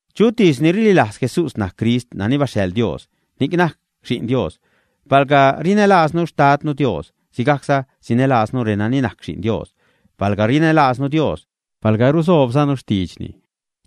Chutis ni rililajz Jesús najc Crist nani baxhaḻ Dios, ni'c najc Xi'n Dios. Palga rinälaaznu Xtadnu Dios, sigajcza sinälaaznu renani najc Xi'n Dios. Palga rinälaaznu Dios, palga rusoobzanu xtiidxni,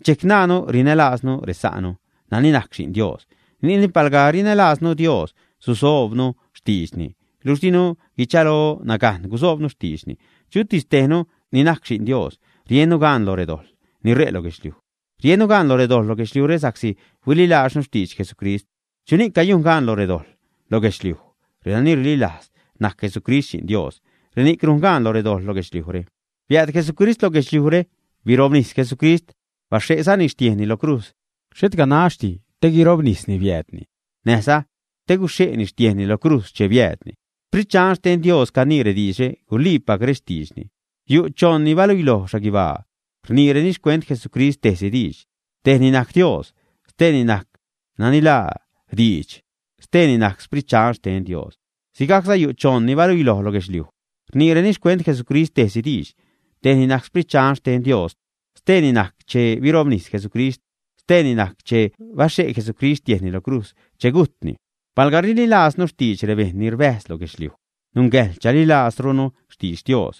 dxejc najnnu rinälaaznu resa'nu nani najc Xi'n Dios. Ni'cni, palga rinälaaznu Dios, susoobnu xtiidxni. Luxh dinu guichalo nagajn gusoobnu xtiidxni. Chutis tejnu ni najc xi'n Dios, riennu gaan lo redojḻ ni ṟe' lo guedxliuj. Riennu gaan lo redojḻ lo guedxliujre sa'csi huililaaznu xtidx Jesucrist. ¿Chuni'c cayujn gaan lo redojḻ lo guedxliuj, ä? Renani rililajz najc Jesucrist, Xi'n Dios, reni'c rujn gaan lo redojḻ lo guedxliujre. Biääd Jesucrist lo guedxliujre. Birobnis Jesucrist, baxhe'zani xtiejnni lo crujz. Xhet ganaxdi te guirobnisni biäädni, näjza te guxhe'ni xtiejnni lo crujz che biäädni. Sprit Dxan xten Dios canii rediidxre. Guliipac rextiidxni. Yu' choṉ ni baluiloj xhaguibaa. Rniireni xcuent Jesucrist tejsi diidx. Tejni najc Dios, steeni najc nani laa Diidx, steeni najc Sprit Dxan xten Dios. Sigajcza yu' choṉ ni baluiloj lo guedxliuj. Rniireni xcuent Jesucrist tejsi diidx. Tejni najc Sprit Dxan xten Dios. Steeni najc che birobnis Jesucrist, steeni najc che baxhe' Jesucrist xtiejnni lo crujz che gujtni. Palga rililaaznu xtidx rebejṉ ni rbäjz lo guedxliuj, nungäjḻ chalilaazrunu xtidx Dios.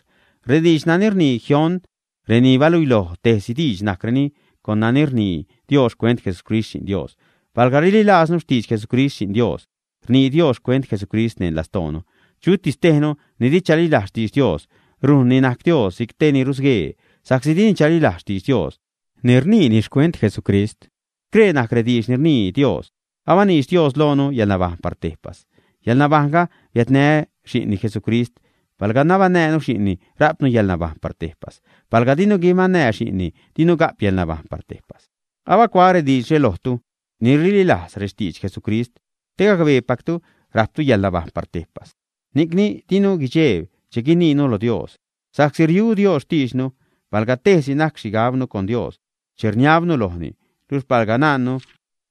Rediidx nani rnii jioṉ reni baluiloj tejsi diidx najcreni con nani rnii Dios xcuent Jesucrist Xi'n Dios. Palga rililaaznu xtidx Jesucrist Xi'n Dios, rnii Dios xcuent Jesucrist neṉ lastoonu. Chutis tejnu ni di chalilajz xtidx Dios, rujnni najc Dios si'c tej ni rusguee sa'csi dini chalilajz xtidx Dios ni rniini xcuent Jesucrist. Scree najc rediidx ni rnii Dios. Abaniidx Dios loonu yäḻnabajṉ par tejpas. Yäḻnabajṉga biädnä Xi'nni, Jesucrist. Palga nabaṉnäjnu Xi'nni, rajpnu yäḻnabajṉ par tejpas. Palga dinu guibaṉnäj Xi'nni, dinu ga'p yäḻnabajṉ par tejpas. Abacuaä rediidxre lojtu ni rililajz rextidx Jesucrist te gacbeepactu rajptu yäḻnabajṉ par tejpas. Ni'cni dinu guidxejb che guiniinu lo Dios, sa'csi riu Dios xtiidxnu palga tejsi najc xhigabnu con Dios che rniabnu lojni. Luxh palga najnnu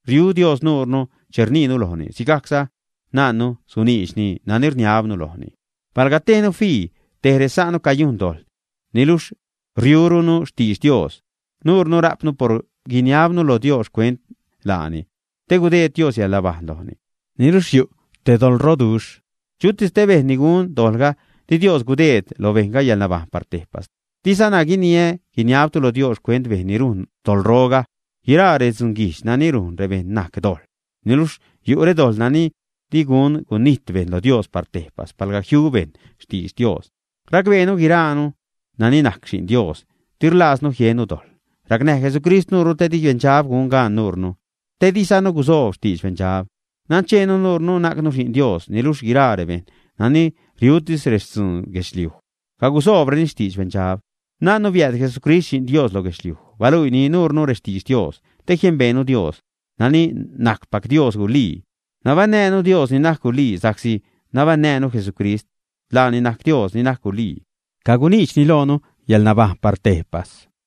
riu Dios nuunu che rniinu lojni, sigajcza najnnu suniidxni nani rniabnu lojni. Palga tejnu fii tej resa'nu cayujn dojḻ, niluxh riuruni xtidx Dios, nuunu rajpnu por guiniabnu lo Dios xcuent laani, te gudeed Dios yäḻnabajṉ lojni. Niluxh yu' te doḻroduxh. Chutis te bejṉ ni gun dojḻga, di Dios gudeed lo bejṉga yäḻnabajṉ par tejpas. Dizana guiniä guiniabtu lo Dios xcuent bejṉ ni rujn doḻroga. Guiraa redzunguijdx nani rujn rebejṉ najc dojḻ. Niluxh yu' redojḻ nani di gun gunijt bejṉ lo Dios par tejpas palga jiu bejṉ xtidx Dios. Racbeenu guiraanu nani najc xi'n Dios di rlaaznu jiennu dojḻ. Racnäj Jesucrist nuunu te di beṉdxab gun gaan nuunu, te dizanu gusoob xtidx beṉdxab. Nancheenu nuure najcnu xi'n Dios, niluxh guiraa rebejṉ nani riutis rextzun guedxliuj cagusoobreni xtidx beṉdxab. Najnnu biääd Jesucrist Xi'n Dios lo guedxliuj. Baluiini nuunu rextidx Dios te jiembeenu Dios, nani najcpac Dios gulii. Nabaṉnäjnu Dios ni najc gulii, sa'csi nabaṉnäjnu Jesucrist. Laani najc Dios ni najc gulii. Caguniidxni loonu yäḻnabajṉ par tejpas.